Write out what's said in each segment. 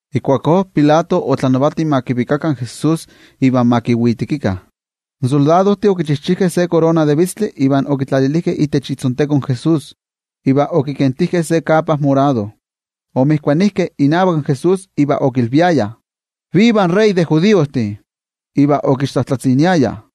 Ijkuakó Pilato otlanavati ma kivikakah in Jesús iva ma kivitekikah. In soldadojtih okichijchijkeh se korona de vitztli iva okitlalilijkeh itech itzonteko in Jesús, iva okikentijkeh se tlakemitl chichilkatlilmiktik. Omotokijkeh inavak Jesús iva okilviayah: —¡Viva in wei tlanavati de judiojtih! Iva okixtlajtlatziniayah.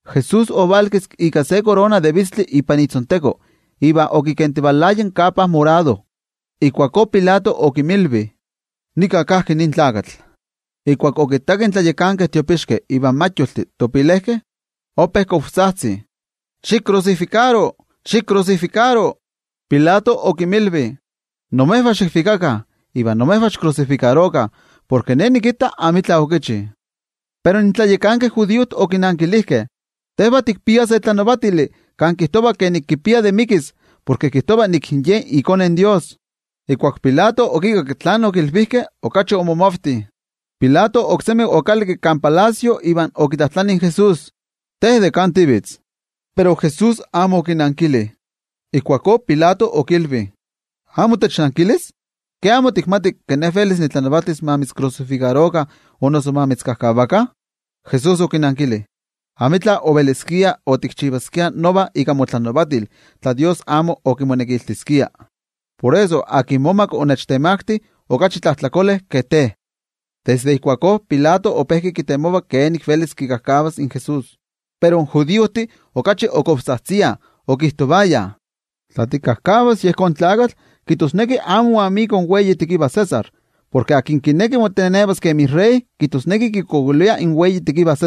Jesús ovalkiski ika se korona de vitztli ipan itzonteko iva okikentivalaya in tlakemitl chichilkatlilmiktik. Ijkuakó Pilato okinmilvi: —¡Nika kajki nin tlakatl! Ijkuak okittakeh in tlayakankeh tiopixkeh ivan templojmayoltih, ope tzajtzih chikavak: —¡Xikrusifikaro, xikrusifikaro! Pilato okinmilvi: —Imejvah xikvikakah, iva imejvah xikrusifikarokah, porke ne nikitta amitla okichi. Pero in tlayakankeh judiojtih okinankilijkeh: —Tejvah tikpiah se tlanavatili kan kijtova nik kipia tlen mikis, porke kijtova ke Ye iKone in Dios. Ijkuak Pilato okikakki tlen okilvijkeh, okachi omomavti. Pilato oksemi okalakki kan palacio iva okitlajtlani in Jesús: —¿Te de kan tivitz? Pero Jesús amo okinankili. Ijkuakó Pilato okilvi: —¿Amo technankilis? ¿Ke amo tikmati ke ne velis nitlanavatis ma mitzkrusifikarokah o noso ma mitzkajkavakah? Jesús okinankili: —Amo otikpiaskia nion itla tlanavatijkayotl itech Ne, tla Dios amo omitzmakaskia tlanavatijkayotl. Por eso, tlen momak onechtemakti, okachi tlajtlakole ke te. Desde ijkuakó Pilato ope kitemova kenik velis kikajkavas in Jesús, pero in judiojtih okachi otzajtziah chikavak, okijtovayah: —¡Tla tikajkavas yejón tlakatl, kijtosneki amo moyolikni in César, porke tlen kineki motenevas kemi wei tlanavati, kijtosneki kikualankaita in César, tlen wei tekiva!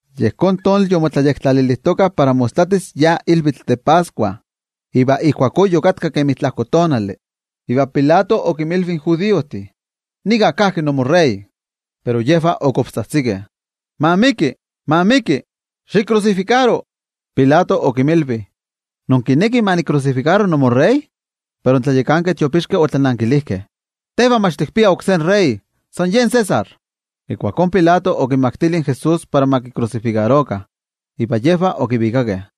Yejón tonali yomotlayektlalilijtokah para mostlatis yi ilvitl de Pascua, iva ijkuakó yokatka kemi tlajko tonali. Iva Pilato okinmilvi in judiojtih: —¡Nika kajki nimowei tlanavati! Pero yejvah otzajtzikeh chikavak: —¡Ma miki! ¡Ma miki! ¡Xikrusifikaro! Pilato okinmilvi: —¿Inkinekih ma nikrusifikaro nimowei tlanavati? Pero in tlayakankeh tiopixkeh otlanankilijkeh: —¡Tejvah mach tikpiah oksé wei tlanavati, san yen César! Ijkuakó Pilato okinmaktili in Jesús para ma kikrusifikarokah, iva yejvah okivikakeh.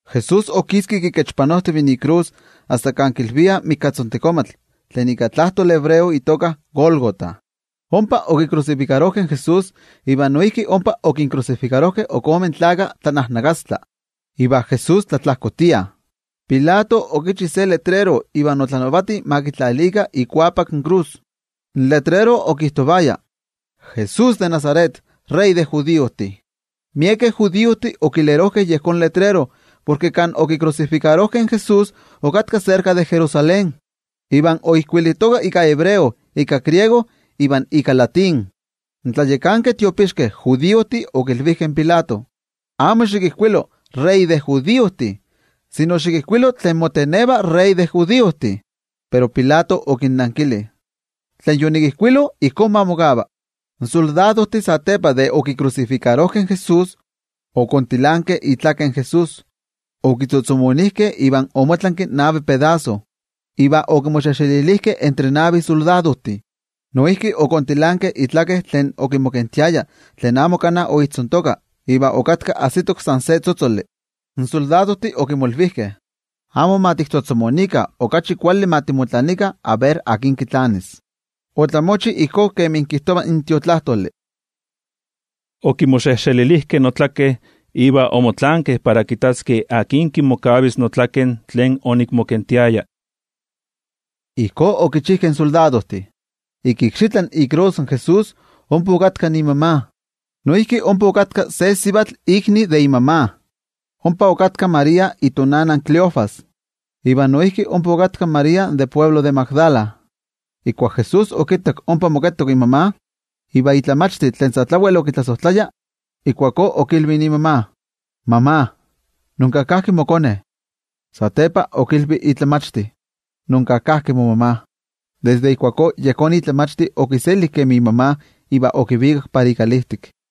Jesús okiski kikechpanojtiv ikrus asta kan kilviah Mikatzontekomatl tlen ika tlajtoli hebreo itoka Gólgota. Ompa okikrusifikarojkeh in Jesús iva noijki ompa okinkrusifikarojkeh ok ome tlakah tlanajnakastla, iva Jesús tlatlajkotia. Pilato okichi se letrero iva otlanavati ma kitlalikah ikuapak in krus. In letrero okijtovaya: “JESÚS DE NAZARET, WEI TLANAVATI DE JUDIOJTIH.” Miekeh judiojtih okilerojkeh yejón letrero porke kan okikrusifikarojkeh in Jesús okatka serka de Jerusalén, iva oijkuilitoka ika hebreo, ika griego iva ika latín. In tlayakankeh tiopixkeh judiojtih okilvijkeh in Pilato: —Amo xikijkuilo: “Wei tlanavati de judiojtih”, sino xikijkuilo: “Tlen moteneva wei tlanavati de judiojtih.” Pero Pilato okinnankili: —Tlen yonikijkuilo ijkó ma mokava. In soldadojtih satepa de okikrusifikarojkeh in Jesús, okontilankeh itzotzol in Jesús, okitzotzomonijkeh omotlanki navi pedaso iva okimoxejxelilijkeh entre navi soldadojtih. Noijki okontilankeh itlaken tlen okimokentiaya tlen amo kana oijtzontoka iva okatka ajsitok san se tzotzoli. In soldadojtih okimolvijkeh: —Amo mach tiktzotzomoniskeh, okachi kuali ma timotlanikah, a ver akin kitlanis. Otlamochi ijkó kemi kijtova in Tiotlajkuiloli: “Okimoxejxelilijkeh notlaken iva omotlankeh para kittaskeh akin kimokavis notlaken tlen onikmokentiaya.” Ijkó okichijkeh in soldadojtih. Ik ikxitla ikrus in Jesús ompa okatka imama, noijki ompa okatka se sivatl ikni de imama, ompa okatka María itonana in Cleofas, iva noijki ompa okatka in María tlen de altepetl Magdala. Ijkuak Jesús okittak imama okatka inakastlan momachti tlen Jesús sa tlawel okitlasojtlaya, ijkuakó okilvi imama: —Sivatl, nonka kajki mokone. Satepa okilvi in momachti: —Nonka kajki momama. Desde ijkuakó yejón momachti okiseli kemi imama iva okivikak para ikalijtik.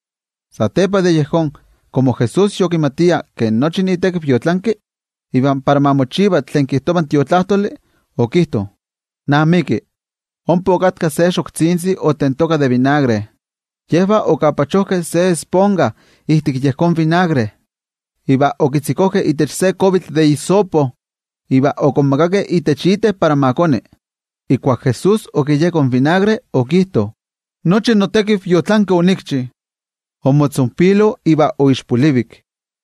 Satepa de yejón, komo Jesús yokimatia ke nochi itekiv yotlanki, iva para ma mochiva tlen kijtova in Tiotlajkuiloli, okijto: —¡Namiki! Ompa okatka se xoktzintzi otentoka de vinagre. Yejvah okapachojkeh se esponja ijtik yejón vinagre, iva okitzikojkeh itech imayo in isopojkuavitl iva okonmakakeh itech iten para ma koni. Ijkuak Jesús okiyeko in vinagre okijto: —¡Nochi notekiv yotlanki onikchi! Omotzonpilo iva oixpolivik.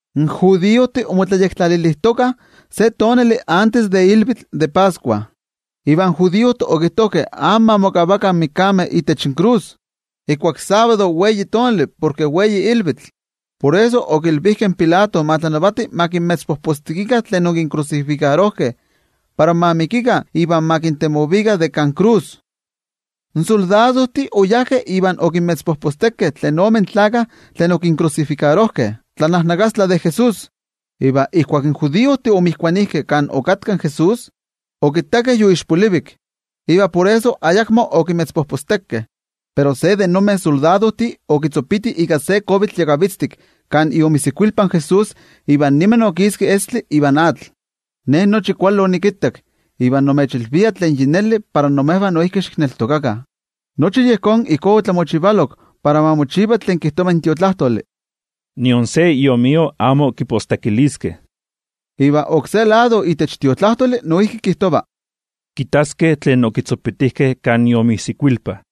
In judiojtih omotlayektlalilijtokah se tonali antes de ilvitl de Pascua, iva in judiojtih okijtojkeh amo ma mokavakah in mikameh itech inkrus ijkuak sábado, porke wei ilvitl. Por eso okilvijkeh in Pilato ma tlanavati ma kinmetzpojpostekikah tlen okinkrusifikarojkeh para ma mikikah iva ma kintemovikah de kan krus. In soldadojtih oyajkeh iva okinmetzpojpostekeh tlen ome tlakah tlen okinkrusifikarojkeh tlanajnakastla de Jesús. Iva ijkuak in soldadojtih omotokijkeh kan okatka in Jesús, okittakeh yoixpolivik. Iva por eso ayakmo okimetzpojpostekeh. Pero se de nonmeh soldadojtih okitzopiti ika se kuavitl yakavitztik kan iomijsikuilpa in Jesús iva niman okiski estli iva atl. Ne nochi kuali onikittak, iva nimechilvia tlen yi neli, para imejvah noijki xikneltokakah. Nochi yejón ijkó opanolok para ma mochiva tlen kijtova in Tiotlajkuiloli: “Nion se iomio amo kipostekiliskeh.” Iva oksé lado itech Tiotlajkuiloli noijki kijtova: “Kitaskeh tlen okitzopitijkeh kan iomijsikuilpa.”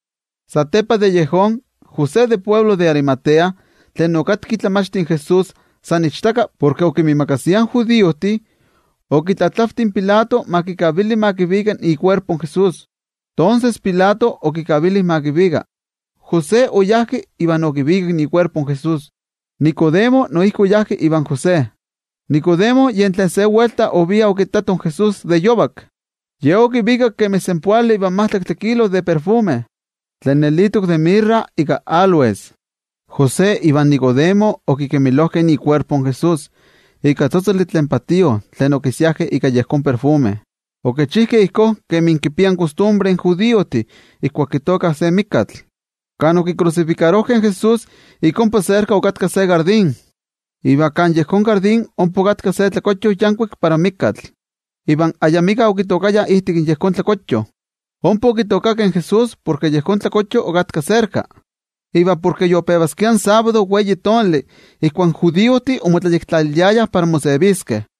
Satepa de yejón, José de altepetl Arimatea, tlen okatka momachti de Jesús san ichtaka porke okinmiimakasia in judiojtih, okitlatlavti in Pilato ma kikavili ma kivika ikuerpo in Jesús. Tonses, Pilato okikavili ma kivika. José oyá iva okivikak ikuerpo in Jesús. Nicodemo noijki oyá ivan José. Nicodemo yen tlen se welta ovia okittato in Jesús de yovak. Ye okivikak kemi senpoali ivan majtlaktli kilo de ajviakayotl, tlen nelitok de mirra ika áloes. José ivan Nicodemo okikemilojkeh ikuerpo in Jesús ika tzotzoli tlen patío tlen okinsiajkeh ika yejón ajviakayotl. Okichijkeh ijkó kemi kipiah kostumbre in judiojtih ijkuak kitooka se mikatl. Kan okikrusifikarojkeh in Jesús ik ompa serka okatka se tlatokxochío, iva kan yejón tlatokxochío ompa okatka se mikatekochtli yankuik kan ayamika ompa okitookayah. Ompa okitookakeh in Jesús porke yejón mikatekochtli okatka serka, iva porke yopevaskia in tonali sábado ijkuak in judiojtih omotlayektlaliliayah para moseviskeh.